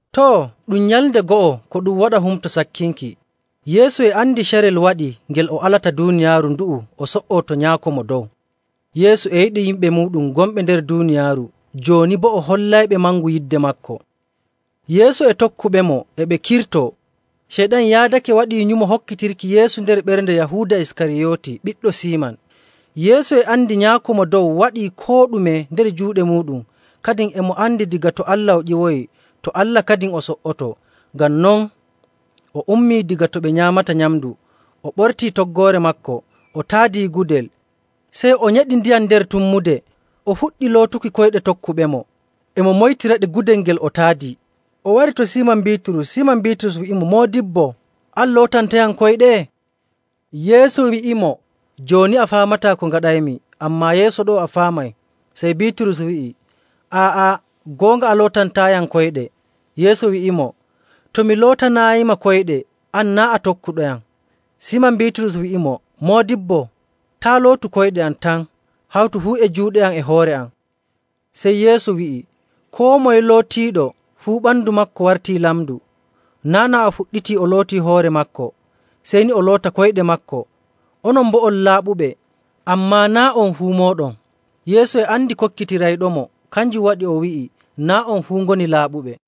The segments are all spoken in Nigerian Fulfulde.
Too, ɗum nyalnde go'o ko ɗum waɗa Humto Sakkinki. Yeesu e andi carel waɗii ngel o alata duuniyaaru ndu'u o so''oo to Nyaako Mo Dow. Yeesu e yiɗi yimɓe muuɗum gonɓe nder duuniyaaru, jooni boo o hollayɓe mangu yidde maako. Yeesu e tokkuɓemo e ɓe kirtoo. Ceyɗan yaadake waɗii nyumo hokkitirki Yeesu nder ɓernde Yahuuda Iskariyooti ɓiɗɗo Siiman. Yeesu e andi Nyaako Mo Dow waɗii koo ɗume nder juuɗe muuɗum, kadin e mo andi daga to Allah o ƴiwoyi, to Allah kadin o so''otoo. Ngam non, o ummii daga to ɓe nyaamata nyamndu, o ɓortii toggoore maako, o taadii gudel. Sey o nyeɗi ndiyam nder tummude, o fuɗɗi lootuki koyɗe tokkuɓemo, e mo moytiraɗe gudel ngel o taadii. O wari to Siiman Biiturus, Siiman Biiturus wi'imo, “Moodibbo, an lootantayam koyɗe?” Yeesu wi'imo, “Jooni a faamataa ko ngaɗaymi, ammaa yeeso ɗo'o a faamay.” Sey Biiturus wi'i, “Aa'a! Goonga a lootantaayam koyɗe.” Yeesu wi'imo, “To mi lootanaayima koyɗe, an naa' a tokkuɗoyam.” Siiman Biiturus wi'imo, “Moodibbo, taa' lootu koyɗe am tan, hawtu fuu e juuɗe am e hoore am!” Sey Yeesu wi'i, “Koo moye lootiiɗo, fuu ɓandu maako wartii lamndu. Naa' naa o fuɗɗitii o lootii hoore maako, sey ni o loota koyɗe maako. Onon boo on laaɓuɓe, ammaa naa' on fuu mooɗon.” Yeesu e andi kokkitirayɗomo, kanjum waɗi o wi'i, “Naa' on fuu ngoni laaɓuɓe.”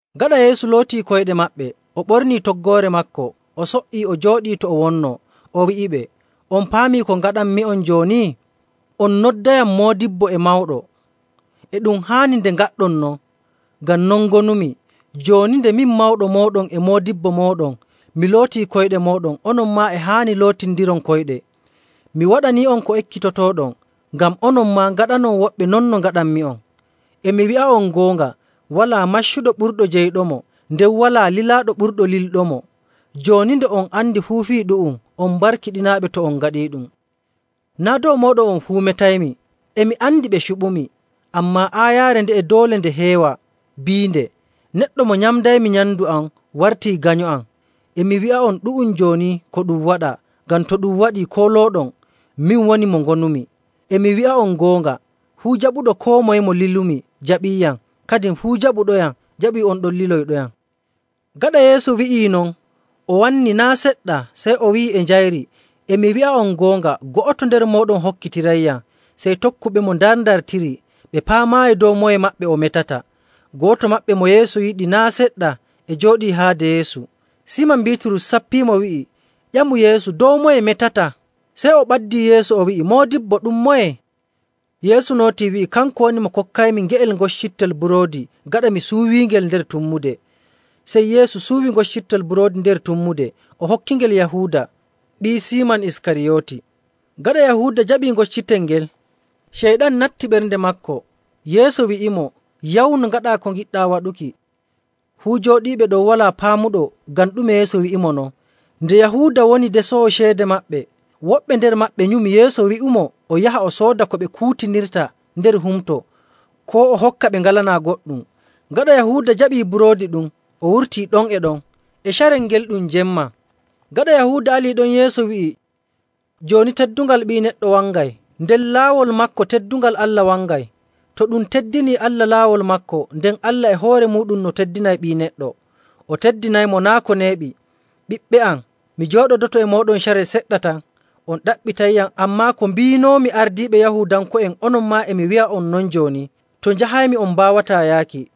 Gaɗa Yeesu lootii koyɗe maɓɓe, o ɓornii toggoore maako, o so''ii o jooɗii to o wonnoo. O wi'iɓe, “On paamii ko ngaɗanmi'on jooni? On noddayam moodibbo e mawɗo, e ɗum haani nde ngaɗɗon non, ngam non ngonumi. Jooni, nde min, mawɗo mooɗon e moodibbo mooɗon, mi lootii koyɗe mooɗon, onon maa e haani lootindiron koyɗe. Mi waɗanii'on ko ekkitotooɗon, ngam onon maa ngaɗanon woɓɓe non no ngaɗanmi'on.. E mi wi'a'on goonga, walaa maccuɗo ɓurɗo jeyɗomo, nden walaa lilaaɗo ɓurɗo lilɗomo.. Jooni nde on andi fuu fii ɗu'um, on barkiɗinaaɓe to on ngaɗiiɗum. “Naa' dow mooɗon on fuu metaymi. E mi andi ɓe cuɓumi. Ammaa aayaare nde'e doole nde heewa biinde, ‘Neɗɗo mo nyamdaymi nyamndu am wartii ganyo am.’. E mi wi'a'on ɗu'um jooni ko ɗum waɗa, ngam to ɗum waɗii koolooɗon, ‘Min Woni Mo Ngonumi.’ E mi wi'a'on goonga, fuu jaɓuɗo koo moye mo lilumi jaɓiiyam, kadin fuu jaɓuɗoyam jaɓii on ɗon liloyɗoyam.”. Gaɗa Yeesu wi'ii non, o wanni naa' seɗɗa, sey o wi'i e njayri, “E mi wi'a'on goonga, go'oto nder mooɗon hokkitirayyam.” Sey tokkuɓemo ndarndartiri, ɓe paamaayi dow moye maɓɓe o metata. Go'oto maɓɓe mo Yeesu yiɗi naa' seɗɗa e jooɗii haade Yeesu. Siiman Biiturus sappiimo wi'i, “Ƴamu Yeesu dow moye metata.” Sey o ɓaddii Yeesu o wi'i, “Moodibbo, ɗum moye?” Yeesu nootii wi'i, “Kanko woni mo kokkaymi nge'el ŋoccitel buroodi gaɗa mi suuwiingel nder tummude.” Sey Yeesu suuwi ŋoccitel buroodi nder tummude, o hokkingel Yahuuda, ɓii Siiman Iskariyooti. Gaɗa Yahuuda jaɓii ŋoccitel ngel, Ceyɗan natti ɓernde maako. Yeesu wi'imo, “Yawnu ngaɗaa ko ngiɗɗaa waɗuki.” Fuu jooɗiiɓe ɗon walaa paamuɗo ngam ɗume Yeesu wi'imo non. Nde Yahuuda woni desoowo ceede maɓɓe, woɓɓe nder maɓɓe nyumi Yeesu wi'umo o yaha o sooda ko ɓe kuutinirta nder humto, koo o hokka ɓe ngalanaa goɗɗum. Gaɗa Yahuuda jaɓii buroodi ɗum, o wurtii ɗon e ɗon. E carel ngel ɗum jemma. Gaɗa Yahuuda alii ɗon, Yeesu wi'i, “Jooni teddungal Ɓii Neɗɗo wangay, nden laawol maako teddungal Allah wangay. To ɗum teddinii Allah laawol maako, nden Allah e hoore muuɗum no teddinay Ɓii Neɗɗo, o teddinaymo naa' ko neeɓi. Ɓiɓɓe am, mi jooɗodoto e mooɗon carel seɗɗa tan. On ɗaɓɓitayyam, ammaa ko mbiinoomi ardiiɓe Yahuudanko'en, onon maa e mi wi'a'on non jooni, ‘To njahaymi, on mbaawataa yaaki.’.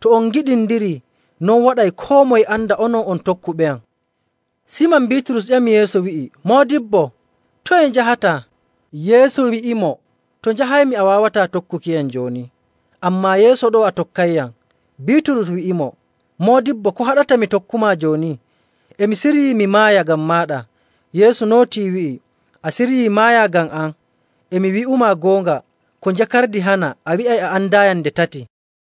To on ngiɗindirii, non waɗay koo moye anda onon on tokkuɓeyam.” Siiman Biiturus ƴami Yeesu wi'i, “Moodibbo, toye njahataa?” Yeesu wi'imo, “To njahaymi, a waawataa tokkukiyam jooni, ammaa yeeso ɗo'o a tokkayyam.” Biiturus wi'imo, “Moodibbo, ko haɗata mi tokkumaa jooni? E mi siryii mi maaya ngam maaɗa.” Yeesu nootii, wi'i, “A siryii maaya ngam am? E mi wi'umaa goonga, ko njakardi hana, a wi'ay a andaayam nde tati.”